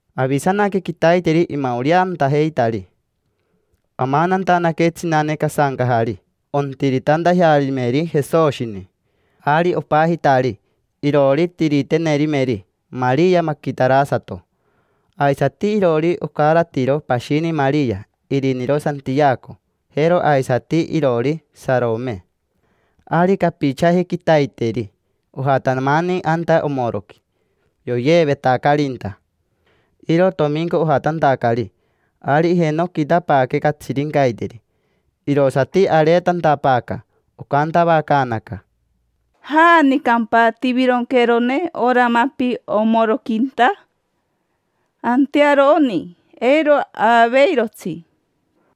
Avisanaque quitaiteri imaoreantajeitari. Amanantanaque tsinane casancajari, ontiritantajearimeri Jesoshini. Ari opajitari iroori tiriterinemeri Maria Maquitarasato. Aisati iroori ocaratiro pashini Maria iriniro Santiaco, jero aisati iroori Sarome. Ari capichaji quitaiteri ojatamani anta omoroqui yoyeevetacarinta. Iro tominco ojatantacari. Ari ijenoquitapaaque catsirincaiteri, irosati areetantapaaca. Ocantavacaanaca: —¿Janicampa tivironqueerone ora mapi omoroquinta? Antearo oni, eiro aaveirotsi.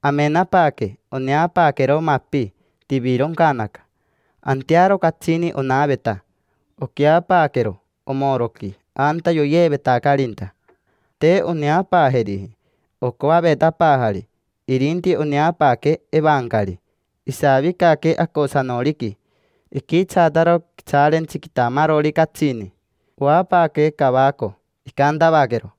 Amenapaaque, oneapaaquero mapi, tivironcanaca. Antearo catsini onaveta. Oqueapaaquero omoroqui anta yoavetacarinta. Te oneapaajeriji ocoavetapaajari, irinti oneapaaque evancari, isavicaque acosanoriqui. Iquitsaataro quitsaarentsi quitamarori catsini. Oapaaque cavaco. Icantavaquero: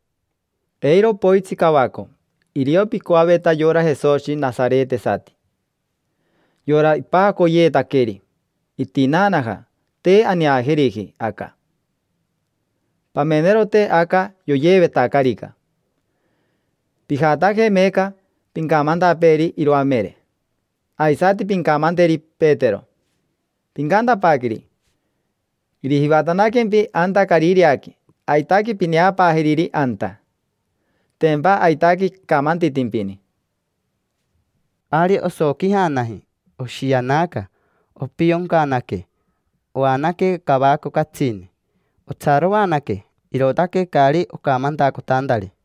—Eiro poitsi cavaco. Irio picoaveta yora Jesoshi nasaretesati, yora ipajacoyeetaqueri. Itinaanaja, te aneajeriji aca. Pamenerote aca yoyeevetacarica. Pijataje meeca, pincamantapeeri iroamere. Aisati pincamanteri Petero. Pincantapaaqueri: “Irijivatanaquempi anta Carireaqui, aitaque pineapaajeriri anta. Tempa aitaque icamantitimpini”. Ari osoquijanaji, oshianaca. Opioncanaque, oanaque cavaco catsini. Otsaroanaque, irootaque caari ocamantacotantari.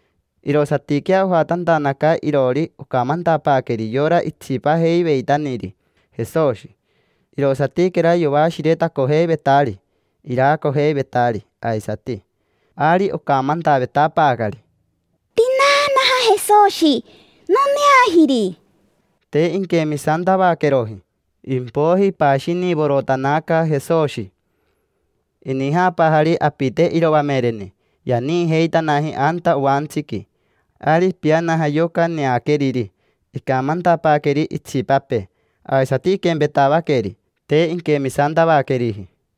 Irosatiquea ojatantanaca iroori ocamantapaaqueri yora itsipajeiveitaniri Jesoshi. Irosatiquera yoashiretacojeivetari, iraacojeivetari aisati. Ari ocamantavetapaacari: —Tinaanaja Jesoshi, noneajiri. Te inquemisantavaqueroji. Impoiji ipashinivorotanaca Jesoshi, inijapaajari apite iroamereni, yaniijeitanaji anta oantsiqui. Ari ipianaja yoca neaqueriri, icamantapaaqueri itsipapee. Aisati iquempetavaqueri, te inquemisantavaqueriji.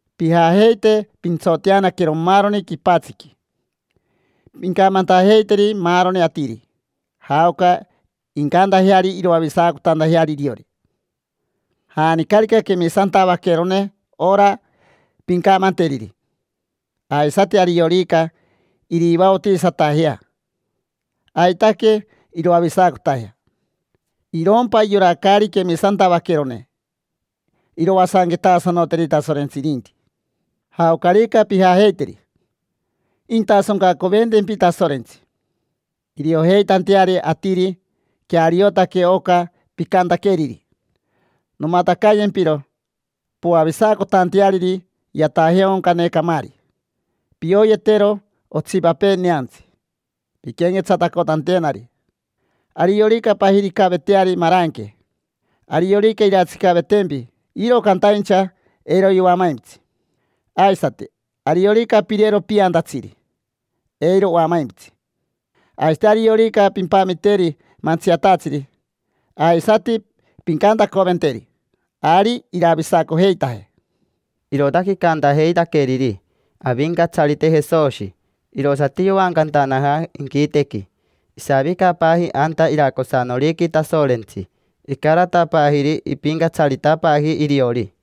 Pijajeite pintsoteanaquero maaroni quipatsiqui. Pincamantajeiteri maaroni atiri jaoca incantajeari iroavisacotantajeari iriori. Janicarica quemisantavaquerone ora pincamanteriri, aisati ariorica irivaotisatajea, aitaque iroavisacotajea. Irompa yora caari quemisantavaquerone, iroasanquetasanoteri Tasorentsi irinti. Jaocarica pijajeiteri, intasoncacoventempi Tasorentsi, iriojeitanteari atiri queariotaque oca picantaqueriri. Nomatacayempiro poavisacotanteariri yatajeaoncane camaari. Pioyetero otsipapee neantsi pinquenquetsatacotantenari. Ariorica pajiricaveteari maranque, ariorica irantsicavetempi, iro cantaincha eiro yoamaimpitsi. Aisati, ariorica pirero piantatsiri, eiro oamaimpitsi. Aisati ariorica pimpamiteri mantsiatatsiri aisati pincantacoventeri, ari iravisacojeitaje. Irootaque icantajeitaqueriri Avincatsarite Jesoshi, irosati yoancantanaja inquitequi, isavicapaaji anta iracosanoriqui Tasorentsi, icaratapaajiri ipincatsaritapaaji iriori.